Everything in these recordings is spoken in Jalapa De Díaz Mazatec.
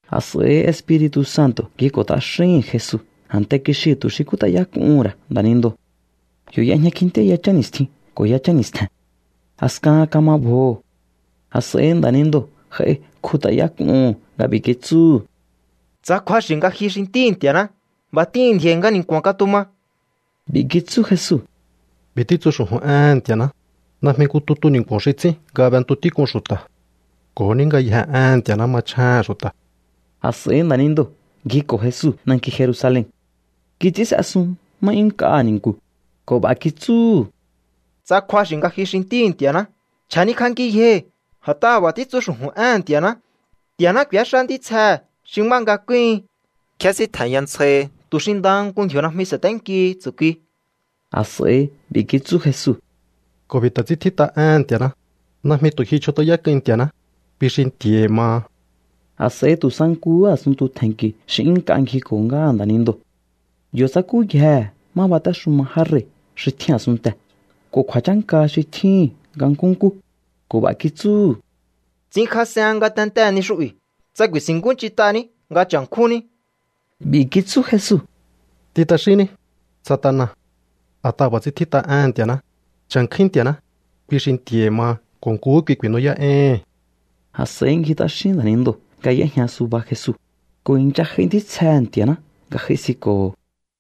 A̱s'a̱i Espiri̱tu̱ Santo̱ ngjiko̱ t'axíhi̱n Jesu a̱nte kixiu̱ tu̱ xi kjút'ayák'uhu̱n ra̱ nda̱nindoo̱. Yo̱ y'ejña kjintíá yachán ni̱stjin ko̱ yachán ni̱stje̱n. A̱skahan kama bjoho̱. A̱s'a̱i nda̱nindoo̱ j'ai kjut'ayák'uhu̱n nga b'i̱ kitsúhu̱: —Tsa kju̱axi̱ nga ji xi Ntíhi̱ Nti̱a̱ná, b'a̱ t'ihi̱n ndji̱o̱i̱ nga ni̱nku̱a̱n katuma. B'i̱ kitsú Jesu: —B'i̱ títsu xu̱ju̱n éhe̱n Nti̱a̱ná: “Najmi nku tutu ni̱nku̱o̱n xi ts'ín nga b'entu tík'un xu̱ta̱. Ko̱ ní ngayjee̱ éhe̱n Nti̱a̱ná machjéhe̱n xu̱ta̱.” A̱s'a̱i nda̱nindoo̱ ngjiko̱ Jesu nanki Jerusalen. Kits'ín s'esun má 'yún nk'aha̱ ni̱nku̱ ko̱ b'a̱ kitsúhu̱: —Tsa kju̱axi̱ nga ji xi Ntíhi̱ Nti̱a̱ná, chja̱nikj'anki yjohi̱. A̱t'aha̱ b'a̱ títsu xu̱ju̱n éhe̱n Nti̱a̱ná: Nti̱a̱ná k'u̱éxá ntítsjehe̱ xi má nga kúhin. Kjésíntje̱nya ntsjahi tu̱ xi ndaha nku ndji̱o̱ najmi sa̱ténkihi tsu̱kui. A̱s'a̱i b'i̱ kitsú Jesu: —Ko̱ b'i̱ ta̱ ts'ín tjít'a éhe̱n Nti̱a̱ná: “Najmi tu̱ ji chjut'ayák'uin Nti̱a̱ná, kui xi Nti̱a̱hi̱ maha.” A̱s'a̱i tu̱ sa nkuhú a̱sunntu tje̱nki̱ xi 'yún nk'a ngjiko̱ ngáha nda̱nindoo̱. Yo̱ tsakúyjehe̱ má batéxuma já rei̱ xi tjín a̱sunntee̱ ko̱ kju̱a̱chánka xi tjíhi̱n nga nkúnkú ko̱ b'a̱ kitsúhu̱: —Ts'inkjas'ehen ngatentee̱ ni xu'bi̱ tsa ku̱i̱si̱nkúnch'int'aní nga cha̱nkjúnní. B'i̱ kitsú Jesu: —T'in t'axínní, Satana. A̱t'aha̱ b'a̱ ts'ín tjít'a éhe̱n Nti̱a̱ná: “Cha̱nkjúín Nti̱a̱ná, kui xi Nti̱a̱hi̱ maha ko̱ nkuhú kui ku̱i̱nú'yá'éíhi̱n.” A̱s'a̱i ngji t'axín nda̱nindoo̱ nga y'éjña suba Jesu, ko̱ i̱ncha j'ai ntítsjehe̱ Nti̱a̱ná nga j'aisinko̱ho̱.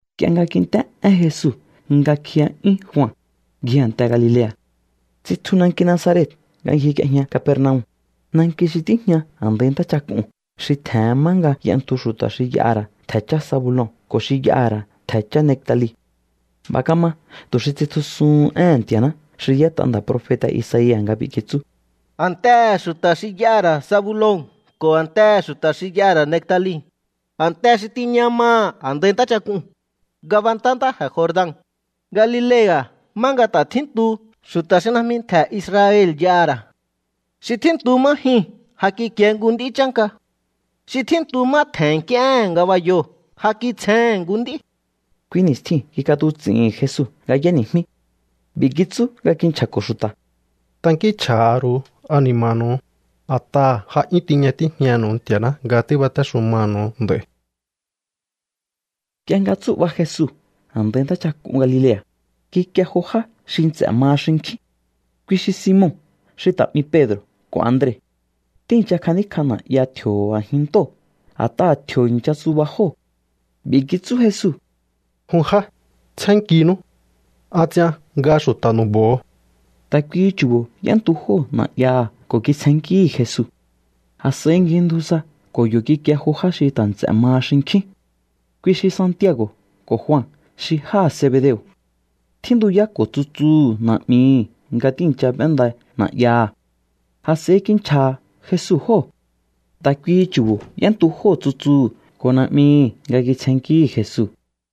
Nk'ie nga kint'é én Jesu nga kjiya'yún Jua, ngji a̱nte Galilea̱. Tsitju nanki Nazaret nga ngjik'iejña Capernaum, nanki xi tíjña a̱ndai ntáchak'uu̱n xi tje̱hen má nga y'entu xu̱ta̱ xi y'aha̱ ra̱ ntje̱ chá Zabulon ko̱ xi y'aha̱ ra̱ ntje̱ chá Neftali. B'a̱ kama tu̱ xi tsitjusuhun éhe̱n Nti̱a̱ná xi y'ét'a nda̱ profeta̱ Isaia̱ nga b'i̱ kitsú: A̱ntehe̱ xu̱ta̱ xi y'aha̱ ra̱ Zabulon ko̱ a̱ntehe̱ xu̱ta̱ xi y'aha̱ ra̱ Neftali, a̱nte xi tiña maha̱ a̱ndai ntáchak'uu̱n, ngabantá ntáje̱ Jordan, Galilea̱ má nga ta̱ tjíntu xu̱ta̱ xi najmi ntje̱ Israel y'aha̱ ra̱. Xi tjíntu má jyuu̱n ja kikie nku nd'í chánka. Xi tjíntu má tje̱n nk'íéhe̱n ngabayoo̱ ja kitsjehe̱n nku nd'í. Kui ni̱stjiu̱n kik'atuts'i̱hi̱n Jesu nga y'éni̱jmí. B'i̱ kitsú nga kinchja̱ko̱ xu̱ta̱: —Tankínchj'a̱ha̱ ru̱u ani̱ma̱nu̱u, a̱t'aha̱ ja 'yún tiña tíjñanu̱u Nti̱a̱ná nga tíbatéxumanu̱u nd'a̱i̱. Nk'ie nga tsú'ba Jesu a̱ndai ntáchak'un Galilea̱, kikie jo já xi nts'e̱ maha xinkjín. Kui xi Simon xi ta̱ 'mi Pedro̱ ko̱ Andre. Tíi̱ncha kjaníkj'a na̱'ya tji̱o̱ho̱ a̱jin ntóo̱, a̱t'aha̱ tji̱o̱ i̱ncha tsuba jóo̱. B'i̱ kitsú Jesu: —Jun já, tsjénnkinú. An ts'ian nga xu̱ta̱ nu̱bo̱o. Ta̱ kuihi chu̱bo̱ y'éntu jóo̱ na̱'yaha̱ ko̱ kitsjennkíhi̱ Jesu. A̱s'a̱i ngjindju sa ko̱ yo̱ kikie jo já xi ta̱ nts'e̱ maha xinkjín. Kui xi Santiago̱ ko̱ Jua xi jáha̱ Zebedeo̱. Tjíntuyáko̱ tsutsuhu̱ na̱'mihi̱ nga tíi̱ncha b'énda na̱'yaha̱. A̱s'a̱i kinchja̱ha̱ Jesu jóo̱. Ta̱ kuihi chu̱bo̱ y'éntu jóo̱ tsutsuu̱ ko̱ na̱'mihi̱ nga kitsjennkíhi̱ Jesu.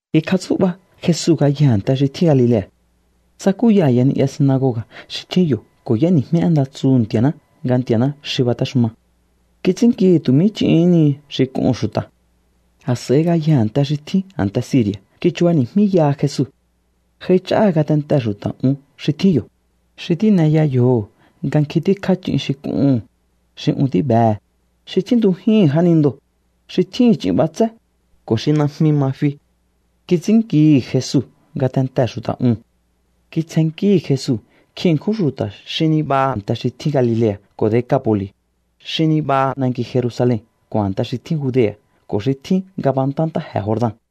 Kikjatsú'ba Jesu ngayjee̱ a̱nte xi tjín Galilea̱. Tsakúya a̱ya ni'ya sinagoga̱ xi tjín yo̱ ko̱ y'éni̱jmí én nda tsuhu̱ Nti̱a̱ná nga Nti̱a̱ná xi batéxuma. Kits'ínnkihi̱ tu̱ mí ch'ihín ni xi k'uhu̱n xu̱ta̱. A̱s'a̱i ngayjee̱ a̱nte xi tjín a̱nte Siri̱a̱ kichubani̱jmíyaha Jesu. J'aich'áha̱ ngatentee̱ xu̱ta̱ un xi tjín yo̱, xi tíneya yjoho̱ nga nkjin tíkjá ch'in xi k'uhu̱n, xi un tíbehe̱, xi tjíntujíhi̱n jánindoo̱, xi tjíhi̱n ch'in b'atsé, ko̱ xi najmi ma fi. Kits'ínnkihi̱ Jesu ngatentee̱ xu̱ta̱ uu̱n. Kitsjennkíhi̱ Jesu nkjin ṉkjún xu̱ta̱ xi nibaha a̱nte xi tjín Galilea̱ ko̱ Decapo̱li̱, xi nibaha nanki Jerusalen ko̱ a̱nte xi tjín Judea̱ ko̱ xi tjín ngabantá ntáje̱ Jordan.